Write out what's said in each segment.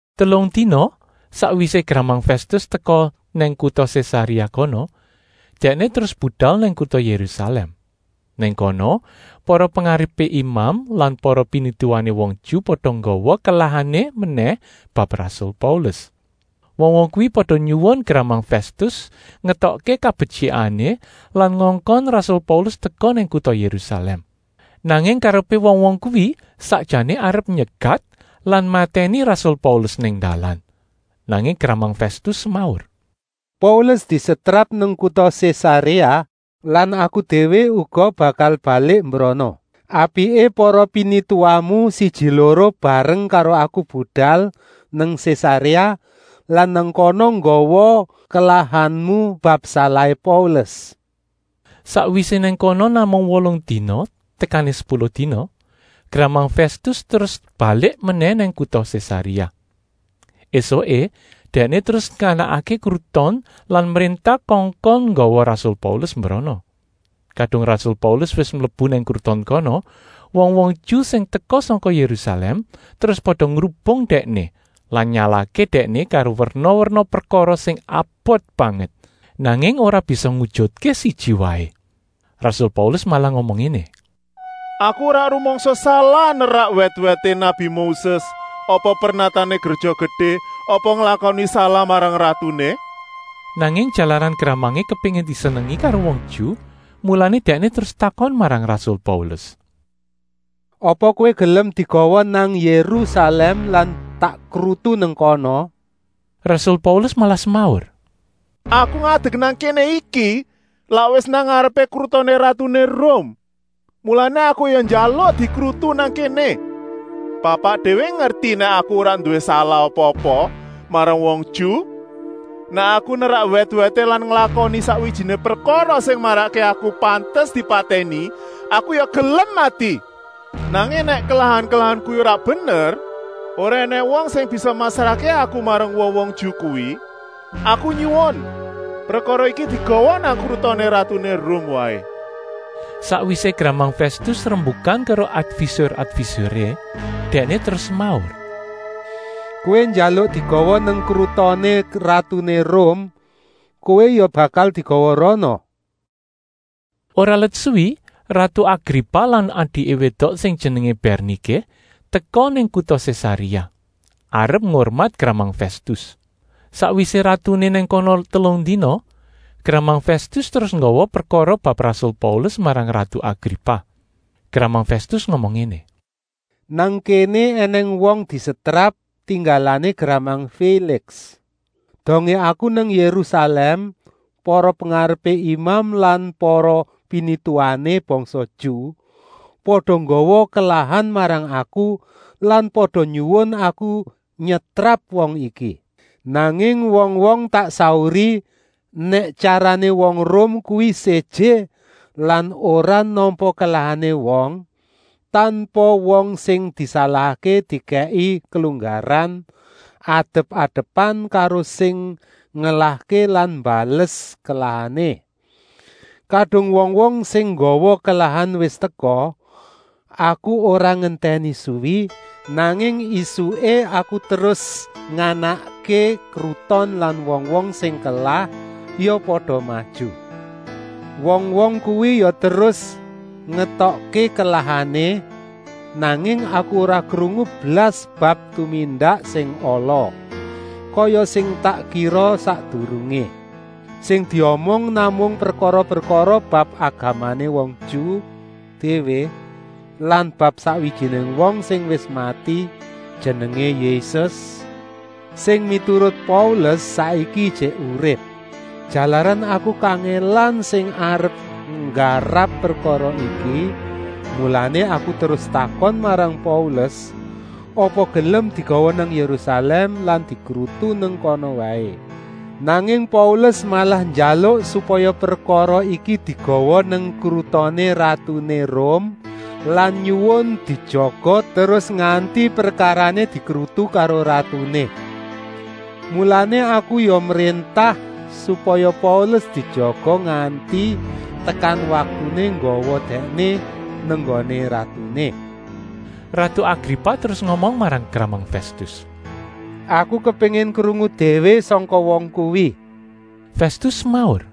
Telung dina sakwisé gramang Fèstus teka nang kuta Sésaréa kono, dèkné terus budal nang kuta Yérusalèm. Nang kono para pengarepé imam lan para pinituwané wong Ju pada nggawa kelahané menèh bab rasul Paulus. Wong-wong kuwi pada nyuwun gramang Fèstus ngétokké kabetyikané lan ngongkon rasul Paulus teka nang kuta Yérusalèm. Nanging karepé wong-wong kuwi sakjané arep nyegat lan matèni rasul Paulus nang dalan. Nanging gramang Fèstus semaur: “Paulus disetrap nang kuta Sésaréa lan aku déwé uga bakal balik mbrana. Apiké para pinituwamu siji-loro bareng karo aku budal nang Sésaréa lan nang kana nggawa kelahanmu bab salahé Paulus.” Sakwisé nang kono namung wolung dina tekané sepuluh dina, gramang Fèstus terus balik menèh nang kuta Sésaréa. Esuké dèkné terus nganakké kruton lan mréntah kongkon nggawa rasul Paulus mbrono. Kadung rasul Paulus wis mlebu nang kruton kono, wong-wong Ju sing teka sangka Yérusalèm terus pada ngrubung dèkné lan nyalahké dèkné karo werna-werna prekara sing abot banget, nanging ora bisa ngujutké siji waé. Rasul Paulus malah ngomong ngéné: “Aku ora rumangsa salah nerak wèt-wèté nabi Moses apa pernatané Gréja Gedé apa nglakoni salah marang ratuné.” Nanging jalaran gramangé kepéngin disenengi karo wong Ju, mulané dèkné terus takon marang rasul Paulus: “Apa kowé gelem digawa nang Yérusalèm lan tak krutu nang kana?” Rasul Paulus malah semaur: “Aku ngadek nang kéné iki lak wis nang ngarepé krutoné ratuné Rum, mulané aku ya njaluk dikrutu nang kéné. Bapak déwé ngerti nèk aku ora nduwé salah apa-apa marang wong Ju. Nèk aku nerak wèt-wèté lan nglakoni sakwijiné prekara sing marakké aku pantes dipatèni, aku ya gelem mati. Nanging nèk kelahan-kelahan kuwi ora bener, ora ènèng wong sing bisa masrahké aku marang wong-wong Ju kuwi. Aku nyuwun prekara iki digawa nang krutoné ratuné Rum waé.” Sakwisé gramang Fèstus rembukan karo advisur-advisuré dèkné terus semaur: “Kowé njaluk digawa nang krutoné ratuné Rum, kowé ya bakal digawa rana.” Ora let suwi ratu Agripa lan adiké wédok sing jenengé Bèrniké teka nang kuta Sésaréa, arep ngurmat gramang Fèstus. Sakwisé ratuné nang kono telung dina, gramang Fèstus terus nggawa prekara bab rasul Paulus marang ratu Agripa. Gramang Fèstus ngomong ngéné: “Nang kéné ènèng wong disetrap, tinggalané gramang Féliks. Dongé aku nang Yérusalèm para pengarepé imam lan para pinituwané bangsa Ju pada nggawa kelahan marang aku lan pada nyuwun aku nyetrap wong iki. Nanging wong-wong tak sauri nèk tyarané wong Rum kuwi séjé lan ora nampa kelahané wong, tanpa wong sing disalahké dikèki kelunggaran adep-adepan karo sing ngelahké lan mbales kelahané. Kadung wong-wong sing nggawa kelahan wis teka, aku ora ngentèni suwi, nanging ésuké aku terus nganakké kruton lan wong-wong sing kelah ya pada maju. Wong-wong kuwi ya terus ngetokké kelahané, nanging aku ora krungu blas bab tumindak sing ala, kaya sing tak kira sakdurungé. Sing diomong namung prekara-prekara bab agamané wong Ju déwé lan bab sakwijiné wong sing wis mati, jenengé Yésus, sing miturut Paulus, saiki ijik urip. Jalaran aku kangèlan sing arep nggarap prekara iki, mulané aku terus takon marang Paulus, apa gelem digawa nang Yérusalèm lan dikrutu nang kana waé. Nanging Paulus malah njaluk supaya prekara iki digawa nang krutoné ratuné Rum lan nyuwun dijaga terus nganti prekarané dikrutu karo ratuné. Mulané aku ya mréntah, supaya Paulus dijaga nganti tekan waktuné nggawa dèkné nang nggoné ratuné.” Ratu Agripa terus ngomong marang gramang Fèstus: “Aku kepéngin krungu déwé sangka wong kuwi.” Fèstus semaur: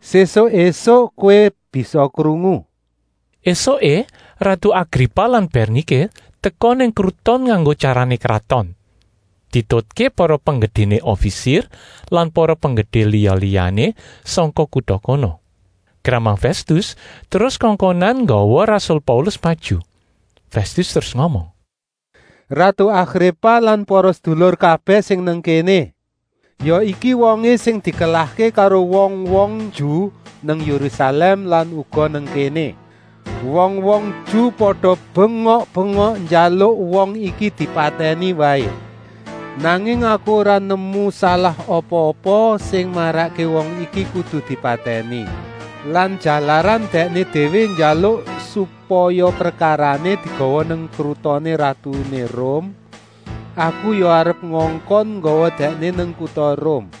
“Sésuk ésuk kowé bisa krungu.” Esuké ratu Agripa lan Bèrniké teka nang kruton nganggo tyarané kraton, dietutké para penggedéné ofisir lan para penggedé liya-liyané sangka kuta kono. Gramang Fèstus terus kongkonan nggawa rasul Paulus maju. Fèstus terus ngomong: “Ratu Agripa lan para sedulur kabèh sing nang kéné. Ya iki wongé sing dikelahké karo wong-wong Ju nang Yérusalèm lan uga nang kéné. Wong-wong Ju pada bengok-bengok njaluk wong iki dipatèni waé. Nanging aku ora nemu salah apa-apa sing marakké wong iki kudu dipatèni. Lan jalaran dèkné déwé njaluk supaya prekarané digawa nang krutoné ratuné Rum, aku ya arep ngongkon nggawa dèkné nang kuta Rum.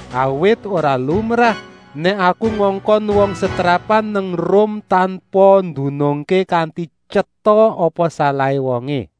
Awit ora lumrah nèk aku ngongkon wong setrapan nang Rum tanpa ndunungké kanti tyeta apa salahé wongé.”